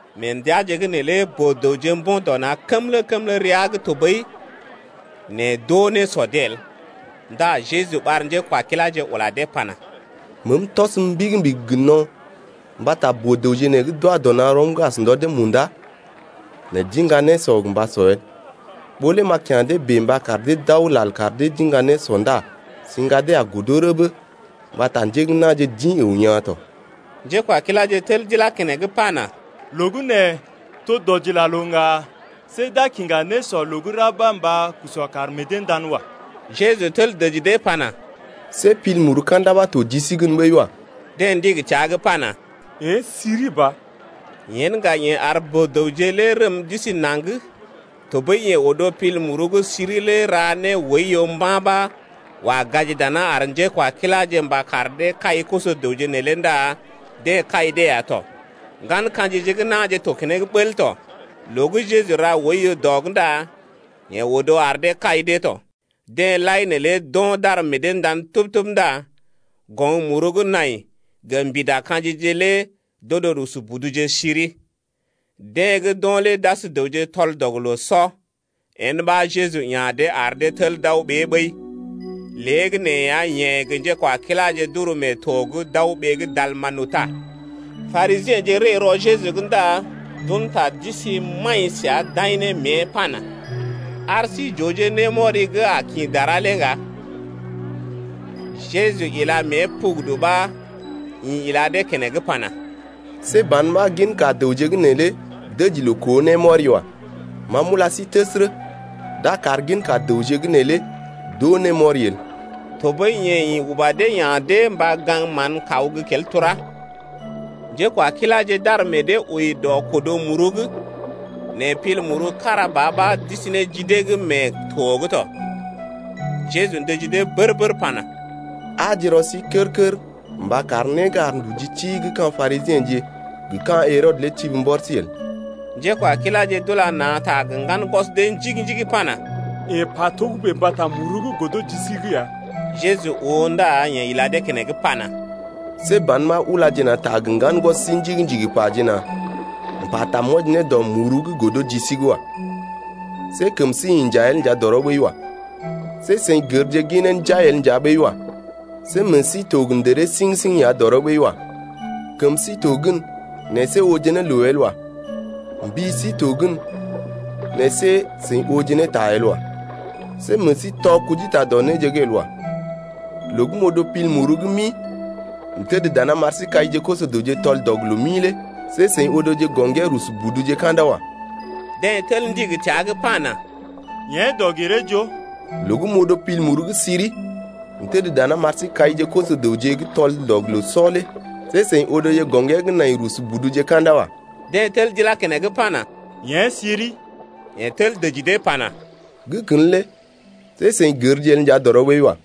Mee ndəaje’g neelé boo-dəwje mbo̰ dɔ na̰ kəmlə-kəmlə rəa’g tɔɓəi, nɛ d’oo nésɔ dee el, ndá Jeju ɓar njékwakiláje ula dee pana: Meem tɔsəm mbigi-mbigi gə no̰ mbata boo-dəwje nee gə́ d’wa dɔ na̰ rɔm’g as ndɔ dee munda, nɛ d’iŋga nésɔ gə́ gə mba sɔ el. Ɓó lé m’a kya̰ dee bèe mba kar dee d’aw lal kar dee d’iŋga nésɔ ndá siŋga dee a godo rəbə mbata njé gə́ na̰je d’ḭ əw yaa̰ tɔ. Njékwakiláje tel d’ilá keneŋ pana: Loo gə́ nee to dɔdilaloo’g ŋga see n’a kiŋgaje nésɔ loo gə́ ra’g ɓa mba k’ar dee d’usɔ d’ar meḛ dee ndan wa. Jeju tel dəji dee pana: See pil muru ka̰da ɓa to ji sí gən ɓəi wa. Deḛ ndigi təa’g pana: Yḛ̀ siri ba. Yen ŋga yeḛ ar boo-dəwje lé rəm d’isi naŋg tɔɓəi yeḛ odo pil muru gə́ siri lé ra ne oiyo mba̰ ɓa wa gaji daná ar njékwakiláje mba kar dee kai koso-dəwje neelé ndá deḛ kai dee ya tɔ. Ŋgan ka̰jije gə́ na̰je to keneŋ bəl tɔ, loo gə́ Jeju ra oiyo dɔ’g ndá yeḛ odo ar dee kai dee tɔ. Deḛ lai neelé d’o̰ d’ar meḛ dee ndan tub-tub ndá goŋ muru gə́ nai gə mbida ka̰jije lé d’odo rusu buduje siri. Deḛ gə́ d’o̰ lé d’as dəwje tɔl-dɔg-loo-sɔ. Yen ɓa Jeju ya̰ dee ar dee tel d’aw ɓée ɓəi. Léegəneeya yeḛ gə njékwakiláje d’uru mee to’g d’aw ɓee gə́ Dalmanuta. Parisiḛje ree rɔ Jeju’g ndá d’un ta d’isi maḭ səa d’aḭ ne mée pana: Ar sí j’ooje némɔri gə́ a kḭ dara lé ŋga. Jeju ila mée pugudu ɓa ḭ ila dee keneŋ pana: See ban ɓa ginka dəwje gə́ nee lé dəji loo koo némɔri wa. Ma m’ula sí təsərə, d’a kar ginka dəwje gə́ nee lé d’oo némɔri el. Tɔɓəi yeḛ ḭ uba dee ya̰ dee mba gaŋg mán kaw gə́ kel turá. Njékwakiláje d’ar meḛ dee wəi dɔ kodo muru’g, nɛ pil muru kára ba ɓa d’isi ne ji dee’g mee to’g tɔ. Jeju ndəji dee bər-bər pana: Aaje rɔ sí kər-kər mba kar né gə́ ar nduji ti gə́ ka̰ Parisiḛje gə ka̰ Herɔdə lé tibi mbɔr sí el. Njékwakiláje d’ula na̰ ta gə ŋgan gwɔs dee njigi-njigi pana: Yeḛ pa togə́bè mbata muru gə́ godo ji sí’g ya. Jeju oo ndá yeḛ ila dee keneŋ pana: See ban ɓa ulaje na̰ ta gə ŋgan gwɔs sí njigi-njigi pajena: M’pata m’wɔji ne dɔ muru gə́ godo ji sí’g wa. See kəm sí inja el nja dɔrɔ ɓəi wa. See seḭ gərje ginee njai el nja ɓəi wa. See meḛ sí to gə ndəree siŋ-siŋ ya dɔrɔ ɓəi wa. Kəm sí to gən nɛ see ooje ne loo el wa. Mbi sí to gən nɛ see seḭ ooje ne ta el wa. See meḛ sí tɔ kujita dɔ néje’g el wa. Loo gə́ m’odo pil muru gə́ mi m’təd dana m’ar sí kaije koso-dəwje gə́ tɔl-dɔg-loo-mi lé see seḭ odoje gɔŋgee rusu buduje ka̰da wa. Deḛ tel ndigi təa’g pana: Yḛ̀ dɔg-giree-joo. Loo gə́ m’odo pil muru gə́ siri m’təd dana m’ar sí kaije koso-dəwje gə́ tɔl-dɔg-loo-sɔ lé see seḭ odoje gɔŋgee gə́ nai rusu buduje ka̰da wa. Deḛ tel d’ilá keneŋ pana: Yḛ̀ siri. Yeḛ tel dəji dee pana: Gə́ kən lé see seḭ gərje el nja dɔrɔ ɓəi wa.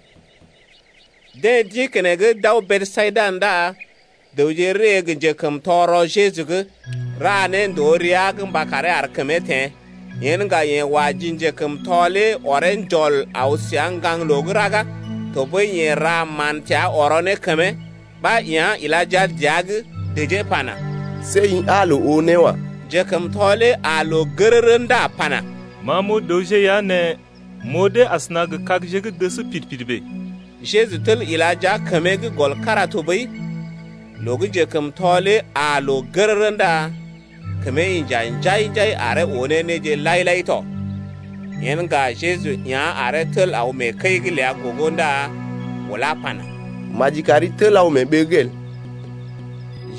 Deḛ d’ḭ keneŋ d’aw Besayida ndá dəwje ree gə njekəmtɔ rɔ Jeju’g, ra ne ndòo rəa’g mba karee ar kəmee teḛ. Yen ŋga yeḛ wa ji njekəmtɔ lé ɔree njɔl aw səa ŋgaŋloo gə́ raga, tɔɓəi yeḛ ra mán təa ɔrɔ ne kəmee, ɓa yá̰ ila jia dəa’g, dəjee pana: See i aa loo oo né wa. Njekəmtɔ lé aa loo gərərə ndá pana: Ma m’oo dəwje ya nɛ m’oo dee asəna gə kagje gə́ dəs pid-pid bèe. Jeju tel ila jia kəmee’g gɔl kára tɔɓəi, loo gə́ njekəmtɔ lé aa loo gərərə ndá kəmee inja njai-njai aree oo ne néje lai-lai tɔ. Yen ŋga Jeju yá̰ aree tel aw mee kəi’g ləa gogo ndá ulá pana: Maji kari tel aw mee ɓee’g el.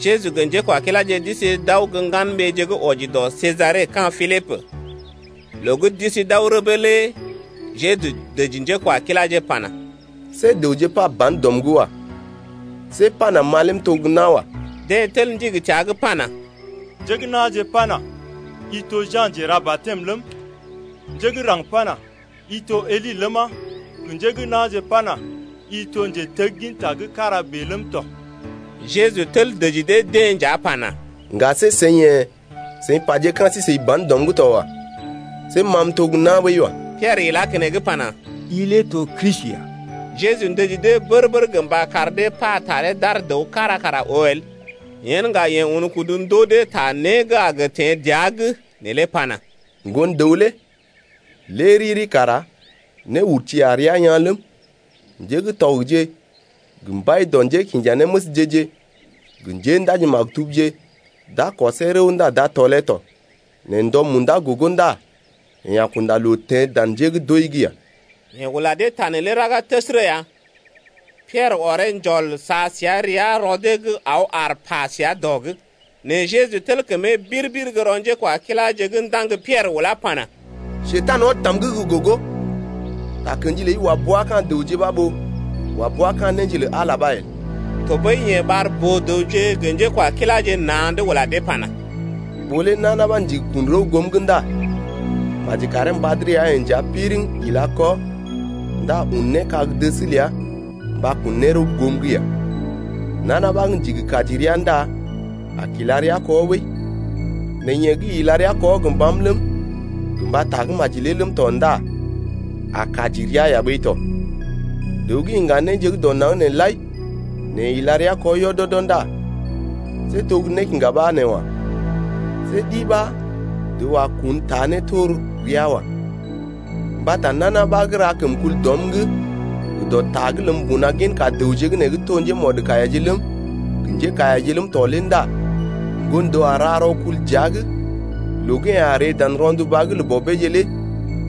Jeju gə́ njékwakiláje d’isi d’aw gə́ ŋgan-ɓeeje gə́ wɔji dɔ Sejare ka̰ Pilibə. Loo gə́ d’isi d’aw rəbə lé Jeju dəji njékwakiláje pana: See dəwje pa ban dɔm’g wa. See pana ma lé m’to gə́ nawa. Deḛ tel ndigi təa’g pana: Njé gə́ na̰je pana: i to gə́ Ja̰ Njera-batɛm ləm, njé gə́ raŋg pana: I to Eli ləma, gə njé gə́ na̰je pana: I to njetegginta gə́ kára bèe ləm tɔ. Jeju tel dəji dee-deḛ nja pana: Ŋga see seḭ yḛ̀ seḭ paje ka̰ sí-seḭ ban dɔm’g to wa. See ma m’to gə́ na̰ ɓəi wa. Piɛrə ilá keneŋ pana: I lé to Kristi ya. Jeju ndəji dee bər-bər gə mba kar dee pa taree d’ar dəw kára kara oo el. Yen ŋga yeḛ un kudu ndoo dee ta né gə́ a gə teḛ dəa’g neelé pana: Ŋgon-dəw lé lé riri kara néurti a rəa yaa̰ ləm, njé gə́ tɔgje gə mbai dɔ njékinjanéməsje-je gə njéndaji-maktubje d’a kɔsee rəw ndá d’a tɔlee tɔ, nɛ ndɔ munda gogo ndá yeḛ a kunda loo teḛ dan njé gə́ d’wəi’g ya. Yeḛ ula dee ta neelé raga təsərə ya. Piɛrə ɔree njɔl sa səa rəa rɔ dee’g aw aar pa səa dɔ’g. Nɛ Jeju tel kəmee bir-bir gə́ rɔ njékwakiláje’g ndaŋg Piɛrə ulá pana: Njekurai, ɔd tam’g gə́ gogo! Takə̰ji ləi wa bua ka̰ dəwje ɓa ɓó wa bua ka̰ néje lə Ala ɓa el. Tɔɓəi yeḛ ɓar boo-dəwje gə njékwakiláje na̰’d ula dee pana: Ɓó lé nana ɓa ndigi kun rəw goom’g ndá maji karee mbad rəa-yeḛ nja piriŋ ila kɔ ndá un ne kag-dəs ləa mba kun ne rəw goom’g ya. Nana ɓa gə́ ndigi kaji rəa ndá a kila rəa kɔ ɓəi, nɛ yeḛ gə́ ila rəa kɔ gə mbam ləm, gə mba tagə́maji lé ləm tɔ ndá a kaji rəa ya ɓəi tɔ. Dəw gə́ iŋga néje gə́ dɔ naŋg nee lai nɛ yeḛ ila rəa kɔ yɔdɔdɔ ndá see to gə́ nékiŋga ɓa nee wa. See ɗi ɓa dəw a kun, taa ne tor rəa wa. Mbata nana ɓa gə́ ra kəmkul dɔm’g gə dɔ ta’g ləm mbuna ginka dəwje gə́ nee gə́ to njémɔdkaiyaje ləm, gə njékaiyaje ləm tɔ lé ndá Ŋgon-dəw a ra rɔkul dəa’g loo gə́ yeḛ a ree dan rɔnduba’g lə bɔbeeje lé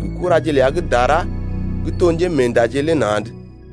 gə kuraje ləa gə́ dara gə́ to njémeendaje lé na̰’d.